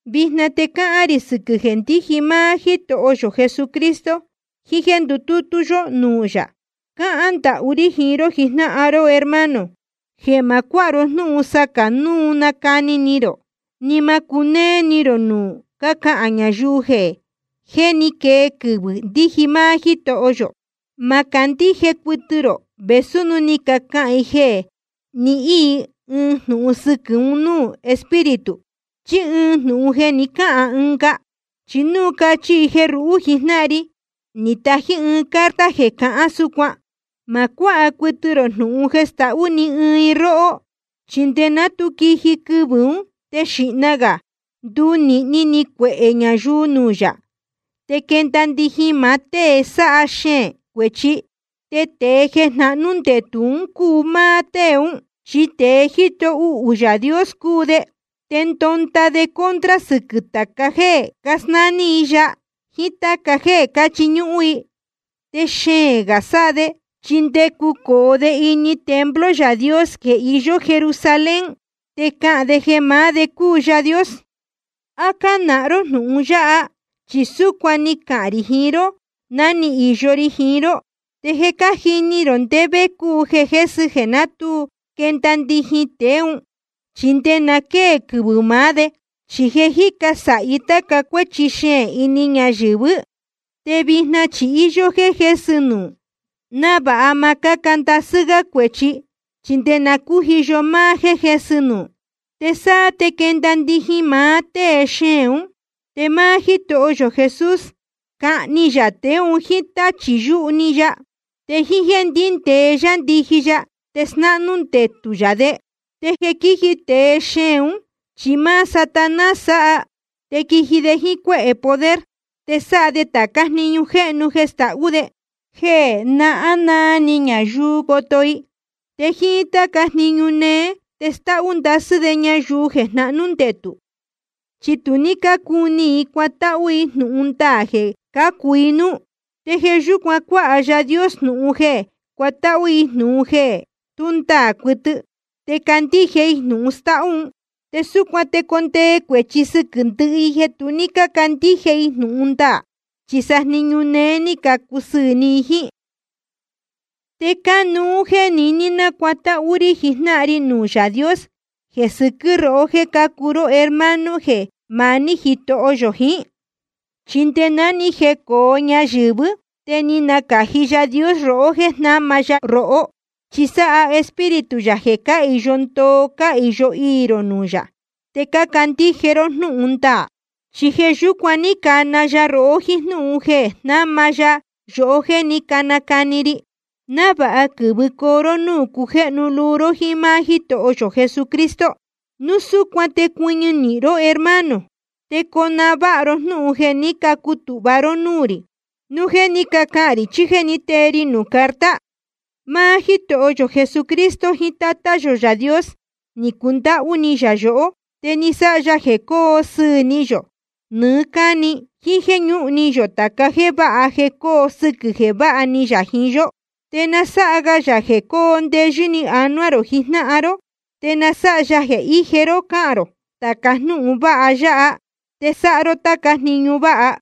Vijna te cahān rī sɨquɨ̄ jeē ndíji máá Jítoho yō Jesucristo jiín jéē ndutútú yó núū yā. Cácahān ndahú rí jiín ró jijnáhan ró hermano, jeē ma cuáha ró jnúhun sacā nuu cani ni rō, ni ma cunéé ni rō núu cácahān ñayuu jeē jé ni quee quɨvɨ̄ ndíji máá Jítoho yō. Ma candíje cuɨtɨ rō vēsú núu cahān i jeē ni níhīn i ɨɨn jnūhun sɨquɨ̄ un núū Espíritu, chí ɨɨn jnūhun jeē ni cáhān ɨnga, chí núu cachi i jeē ruhú jijnáhan ri ni tají ɨɨn carta jeē cahán súcuan. Ma cuáha cuɨtɨ rō jnūhun jeē stahú ni ɨɨn i róhó. Chi nde ná tu quiji quɨvɨ̄ ún te xīhna gā ndunīhni ni cuehē ñayuu nuū yā, te quenda ndijin máá tée sáha xeēn cuēchi, te tēe jnáhnū ndetū cúu máá tée ún. Chi tēe jíto uhū Yaā Dios cúu de, te ndonda de contra sɨquɨ̄ tāca jéē casnání i yaā i jíín táca jeē cáchiñúhún i. Te xeēn gā sáha de, chi nde cucōo de ini templo Yaā Dios jeē iyó Jerusalén, te cahān de jeē maá de cúu Yaā Dios. ¿A cánahán ró jnūhun yáha? Chi súcuan ni cahān rī jiín ró ná ni īyo ri jiín ró. Te je cájini rō ndé vé cúu jeē jésɨ jeē ná tu quenda ndijin tēe ún, chi nde na quée quɨvɨ̄ maá de. Chi je jícu sāhi táca cuéchi xeēn ini ñayɨ̄vɨ́, te vijna chi íyó jéē jésɨ nuū, návāha ma cáa ndasɨ́ gá cuēchi, chi nde na cújiyo máá jéē jésɨ nuū. Te sáá te quenda ndijin maá tée xeēn ún. Te máá Jítoho yō Jesús cahni ya tēe un jíín táchī yuhu‑ni ya, te jíín jéē ndíndēe yá ndiji ya te snáhnú ndetū yā de. Te jeē quíji tēe xeēn ún chi máá Satanás sáha. Te quiji de jíín cuéhē poder, te sáha de tācá jniñu jéhnu jeē stahú de, jeē nahán naa ni ñayuu coto i. Te jíín táca jniñu néé te stáhú ndasɨ́ de ñayuu jeē jnahnú ndetū, chi tu ní cúní i cuatáhú i jnūhun ndaā jeē cácu i núú. Te jeē yúcuan cuāha Yaā Dios jnūhun jeē cuatáhú i jnūhun jeē tú ndaā cuɨtɨ, te candíje i jnūhun stáhú un. Te súcuan te jecondee cuēchi sɨquɨ̄ ndɨhɨ i jeē tu ní cácandíje i jnūhun ndaā, chi sa jniñu néé ni cacusɨɨ̄ ni i jíín. Te cánuú jéē niní nacuatáhú rí jijnáhan ri nuū Yaā Dios jeē sɨquɨ́ rohó jéē cácuu ró hermano jeē maní Jítoho yō jiín. Chi nde ná ni jecōo ñayɨ̄vɨ́, te je ni nacāji Yaā Dios rohó jéē jnáma ya rohó. Chi sáha Espíritu yā jeē cáhīyo ndoo cáhīyo iī rō nuū yā te cácandíje ró jnúhun ndaā. Chi jeē yúcuan ní cana ya rohó jíín jnúhun jeē jnáma ya yohó jeē ní canacani ri, návāha quɨ̄vɨcoo ró núū cujéhnu luu ró jíín máá Jítoho yō Jesucristo. Núu súcuan te cuɨñɨ nīhin ró hermano, te conahán váha ró jnúhun jeē ní cacutūhva ró núū rī, núu jeē ní cacahān rī chí jéē ní tee ri nuū carta. Máá Jítoho yō Jesucristo jiín Tátá yō Yaā Dios ni cundáhú ni yā yohó, te ni sáha ya jeē coo sɨɨ̄ ni yō nɨɨ́ cáni, jíín jéē ñúhun ni yō tāca jéē váha jeē coo sɨquɨ̄ jeē váha ni yā jiín yó. Te na sáha ga yā jeē cóo ndeyɨ́ ni anuá rō jijnáhan ró, te na sáha ya jeē íje ró cáhān rō tāca jnúhun vāha ya, te sáha ró táca jniñu váha.